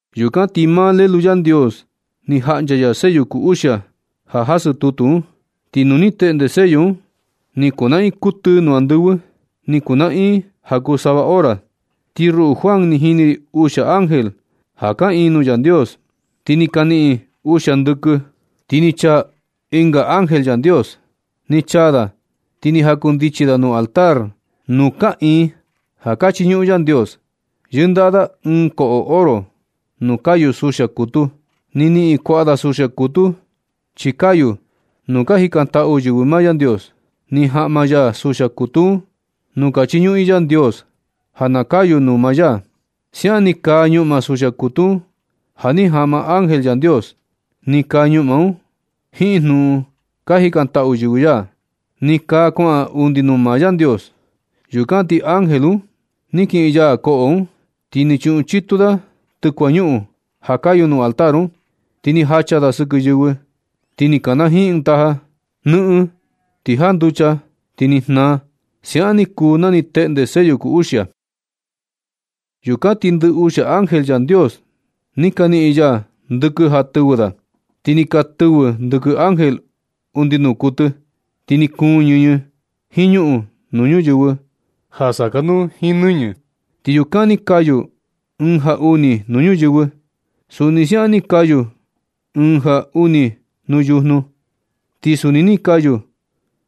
Yukan ti maa Lelu Yandios ni jaꞌncha ya sello kuu uxia ja jasɨ tutu un. Ti nu ni teꞌnde sello un, ni kunaꞌin kuɨtɨ nuu andɨvɨ. Ni kunaꞌin ja kuu sava hora. Ti ruꞌu Juan ni jini ri uxia ángel ja kaꞌiin nuu Yandios, ti ni ka niꞌin uxia ndɨkɨ. Ti ni chaa ɨnga ángel Yandios. Ni chaa da ti ni jakundichi da nuu altar nuu kaꞌiin ja ka chiñuꞌun Yandios. Yɨndaꞌa da ɨɨn koꞌo oro nuu kayu suxia kutu. Ni niꞌin kuaꞌa da suxia kutu chi kayu nuu ka jikantaꞌu yɨvɨ maa Yandios. Ni jaꞌma ya suxia kutu un nuu ka chiñuꞌun i Yandios, ja na kayu nuu maa ya. Siaꞌan ni kaa ñuꞌma suxia kutu un ja ni jaꞌma ángel Yandios. Ni kaa ñuꞌma un jiin jnuꞌun ka jikantaꞌu yɨvɨ ya. Ni kaa kuaꞌan undi nuu maa Yandios. Yukan ti ángel un ni kiꞌin ya koꞌo un, ti ni chuꞌun chitu da tɨkuañuꞌun ja kayu nuu altar un, ti ni jacha da sɨkɨ ñuyɨvɨ. Ti ni kanajiin ɨɨn taja. Nɨꞌɨn, ti janducha, ti ni jnaa. Siaꞌan ni kuu na ni teꞌnde sello kuu uxia. Yukan ti ndɨ uxia ángel Yandios ni ka niꞌin ya ndɨkɨ ja tɨvɨ da. Ti ni tɨvɨ ndɨkɨ ángel undi nuu kuɨtɨ. Ti ni kuun ñɨñɨ jiin ñuꞌun nuu ñuyɨvɨ ja sakanuu jiin nɨñɨ. Ti yukan ni kayu ɨɨn ja uni nuu ñuyɨvɨ. Suni siaꞌan ni kayu ɨɨn ja uni nuu yujnu. Ti suni ni kayu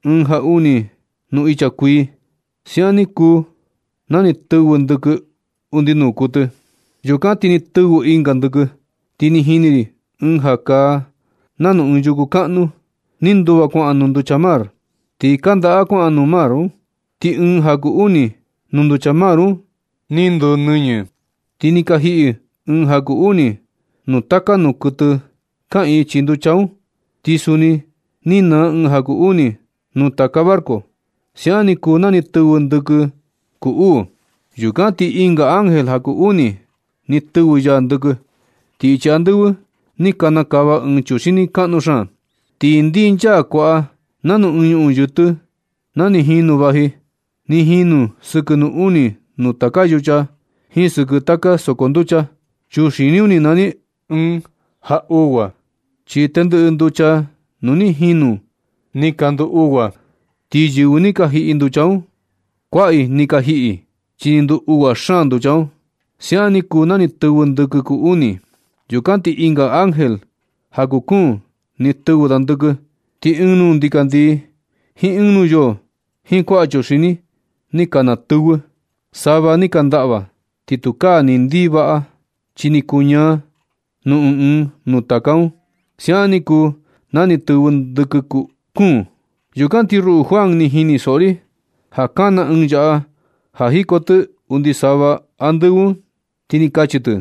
ɨɨn ja uni nuu icha kuii. Siaꞌan ni kuu na ni tɨvɨ ndɨkɨ undi nuu kuɨtɨ. Yukan ti ni tɨvɨ ɨnga ndɨkɨ. Ti ni jini ri ɨɨn ja kaa nanu ɨɨn yuku kaꞌnu ni nduva kuaꞌan nuu nducha mar, ti kandaꞌa kuaꞌan nuu mar un. Ti ɨɨn ja kuu uni nuu nducha mar un ni nduu nɨñɨ. Ti ni ka jiꞌi ɨɨn ja kuu uni nuu taka nuu kuɨtɨ kaꞌiin chii nducha un. Ti suni ni naa ɨɨn ja kuu uni nuu taka barco. Siaꞌan ni kuu na ni tɨvɨ ndɨkɨ kuu uu. Yukan ti ɨnga ángel ja kuu uni ni tɨvɨ ya ndɨkɨ. Ti ichi andɨvɨ ni kanakava ɨɨn chuxini kaꞌnu xaan. Ti ndinchaa kuaꞌa nanu ɨɨn ñuꞌun yɨtɨ na ni jinu vaji. Ni jinu sɨkɨ nuu uni nuu taka yucha jiin sɨkɨ taka soko nducha. Chuxini un ni nani ɨɨn ja uꞌgua, chi tendɨꞌɨ nducha nuu ni jinu ni ka nduu uꞌgua. Ti yɨvɨ ni ka jiꞌi nducha un, kuaꞌa i ni ka jiꞌi, chi ni nduu ugua xaan nducha un. Siaꞌan ni kuu na ni tɨvɨ ndɨkɨ kuu uni. Yukan ti ɨnga ángel ja kuu kuun ni tɨvɨ da ndɨkɨ. Ti ɨɨn nuu ndikandii jiin ɨɨn nuu yoo jiin kuaꞌa chuxini ni ka natɨvɨ. Sava ni ka ndaꞌva. Ti tukaa ni ndii vaꞌa chi ni kuñaa nuu ɨɨn ɨɨn nuu taka un. Siaꞌan ni kuu na ni tɨvɨ ndɨkɨ kuu kuun. Yukan ti ruꞌu Juan, ni jinisoꞌo ri ja kana ɨɨn yaꞌa ja jiko tɨ undi sava andɨvɨ un, ti kachi tɨ: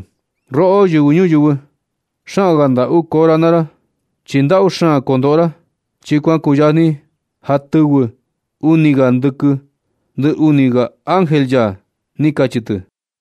―Roꞌo yɨvɨ ñuyɨvɨ, xaan ga ndaꞌu koo ra naa ra, chi ndaꞌu xaan kondoꞌo ra, chi kuan kuyajni ja tɨvɨ uni ga ndɨkɨ ndɨ uni ga ángel ya ―ni kachi tɨ.